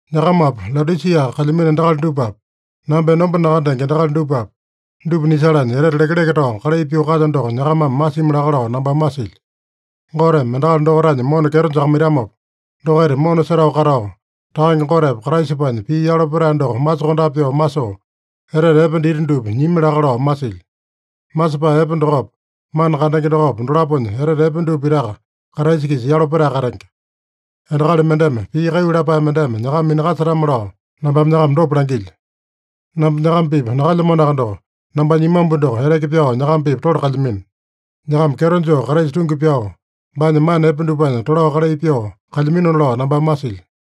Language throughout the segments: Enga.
Nyakamapi, Laodisia kalyamino endakali dupapi, namba enomba nakandenge endakali dupapi, dupa nisalanya etete lekeleke tao kalai pyoo kalyo doko nyakamame masimi laka lao nambame masilyo. Goteme endakali dokaitanya mona kyeto jakamaitamopa, dokaita mona setao katao, Takange Gotepa Kraisapanya pii yalo petae doko masokondape pyoo masoo, etete epe dita dupa nyimi laka lao masilyo. Masepae epe dokopa, mana kandenge dokopa, dolaponya etete epe dupa pitaka Kraisa-kisa yalo petae katenge. Endakali mendeme pii kaiyu lapae mendeme nyakama minakasetame-lao nambame nyakama dopa langilyo. Namba nyakama-pipa nakalyamanoaka doko, nambanya imambu doko eteke pyao nyakama-pipa tole kalyamino. Nyakama kyeto joo Kraisa tungi pyao, baanya mana epe dupanya tolao kalai pyoo kalyaminona lao nambame masilyo.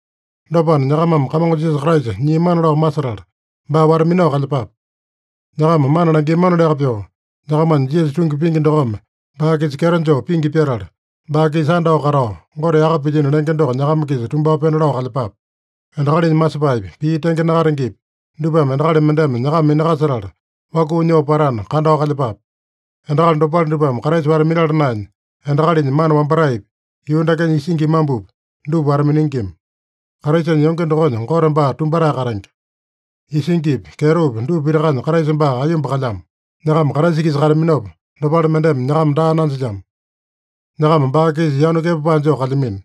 Dopana, nyakamame Kamongo Jisasa Kraisa nyiamana lao masetala, baa wata-minao kalyepape. Nyakama mana langiamanoliaka pyoo, nyakamanya Jisasa tungi pingi dokome baa-kisa kyeto joo pingi pyatala, baa-kisa andao katao, Gote yaka pilyino lenge doko nyakama-kisa tumbao pena lao kalyepape. Endakalinya masepaepi, pii tenge nakatengepi, dupame endakali mendeme nyakama minakasetala wakuu nyoo patana, kandao kalyepape. Endakali dopale dupame Kraisa wata-minala naenya, endakalinya mana wambataepi, yuu dakenya isingi imambupi, dupa wata-miningima. Kraisanya yonge dokonya Gote baa tumbatae katenge. Isingipi, kyetopi dupa pitakanya Kraisa baa aiyomba kalyamo. Nyakama Kraisa-kisa kataminopa, dopale mendeme nyakama daa nanjilyamo. Nyakama baa-kisa yanu kepapae joo kalyamino.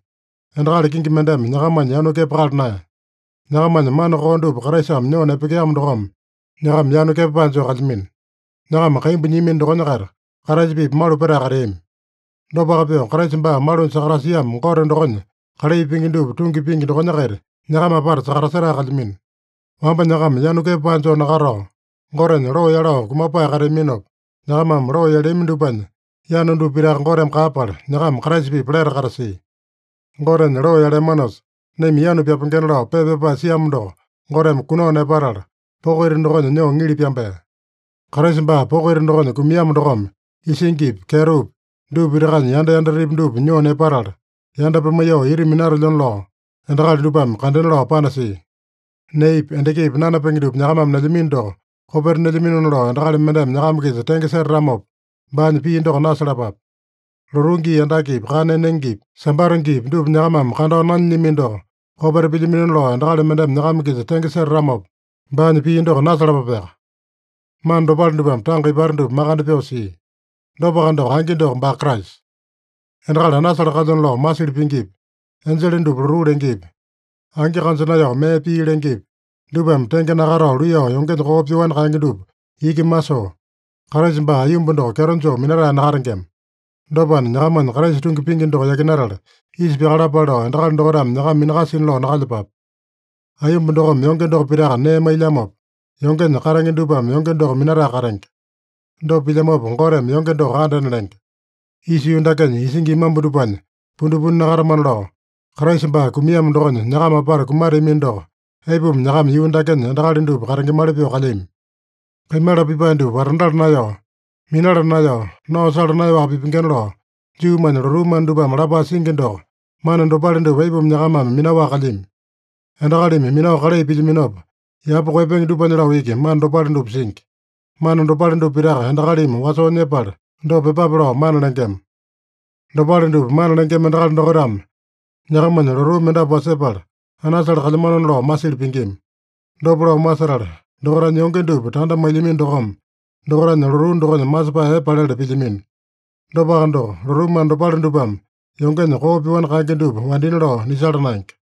Endakali kingi mendeme nyakamanya yanu kepakala naeya. Nyakamanya mana koo dupa Kraisame nyoo nepekeamo dokome, nyakama yanu kepapae joo kalyamino. Nyakama kaimbu nyiamino dokonya-kaita Kraisa-pipa malu petae kateami. Dopaka pyoo, Kraisa baa malunya sakatasiamo Gote dokonya kalai pingi dupa tungi pingi dokonya-kaita nyakama apata sakatasetae kalyamino. Wamba nyakama yanu kepapae joo nakatao, Gotenya loo yalao kumapae kateaminopa, nyakamame loo yaleami dupanya yanu dupa pitaka Goteme kaeyapala, nyakama Kraisa-pipa lete katasia. Gotenya loo yaleamanosa, naima yanu pyapengena lao pepa pyapae siamo doko Goteme kunao nepatala, poko ita dokonya nyoo ŋili pyambea. Kraisa baa poko ita dokonya kumiamo dokome isingipi, kyetopi, dupa pitakanya yanda yandatepi dupa nyoo nepatala, yanda pimaiyoo ita minatelyona lao, endakali dupame kandena lao panasia. Neepi, endakipi nanapenge dupa nyakamame nelyamino doko kopeta nelyaminona lao endakali mendeme nyakama-kisa tenge setatamopa, baanya pii doko nasalapape. Lotuu gii andakepi, kana enengepi, Sambata giipi, dupa nyakamame kandao nanyilyamino doko kopeta pilyaminona lao endakali mendeme nyakama-kisa tenge setatamopa, baanya pii doko nasalapapeaka. Mana dopale dupame tanga ipata dupa makande pyoo sia. Dopaka doko, angi doko baa Kraisa. Endakali anasale kalyona lao masili pingipi, enjele dupa lotuu lengepi, angi kanja naeyao mee pii lengepi, dupame tenge nakatao luiyao yongenya koo pyoani kaenge dupa iki masoo, Kraisa baa aiyomba doko kyeto joo minatae nakatengema. Dopana, nyakamanya Kraisa tungi pingi doko yakinatala isa pyakalapale lao endakali dokaitame nyakama minakasina lao nakalyepape. Aiyomba dokome yonge doko pitaka nee mailyamopa, yongenya katenge dupame yonge doko minatae katenge. Dopa pilyamopa, Goteme yonge doko andena lenge. Isa yuu dakenya isingi imambu dupanya pundipundi nakatamana lao, Kraisa baa kumiamo dokonya nyakama apata kumateamino doko, aipuma nyakama yuu dakenya endakali dupa katengemali pyoo kalyami? Kaimala pipae dupa watandala naeyao, minala naeyao, nao sala naeyaowaka pipengena lao Juumanya lotuu mana dupame lapae singi doko, mana dopale dupa aipuma nyakamame minaowaka kalyami? Endakalimi minao kalai pilyaminopa, yapa koeyapenge dupanya lao iki mana dopale dupa singi. Mana dopale dupa pitaka endakalimi wasoo nyepala, dopa pyepape lao mana lengema. Dopale dupa mana lengema endakali dokaitame nyakamanya lotuu mendapu wasepala, anasale kalyamanona lao masili pingima. Dopa lao masetala, dokaitanya yonge dupa tanda mailyamino dokome, dokaitanya lotuu dokonya masepae epe palele pilyamino. Dopaka doko, lotuu mana dopale dupame yongenya koo pyoani kaenge dupa wandina lao nisala naenge.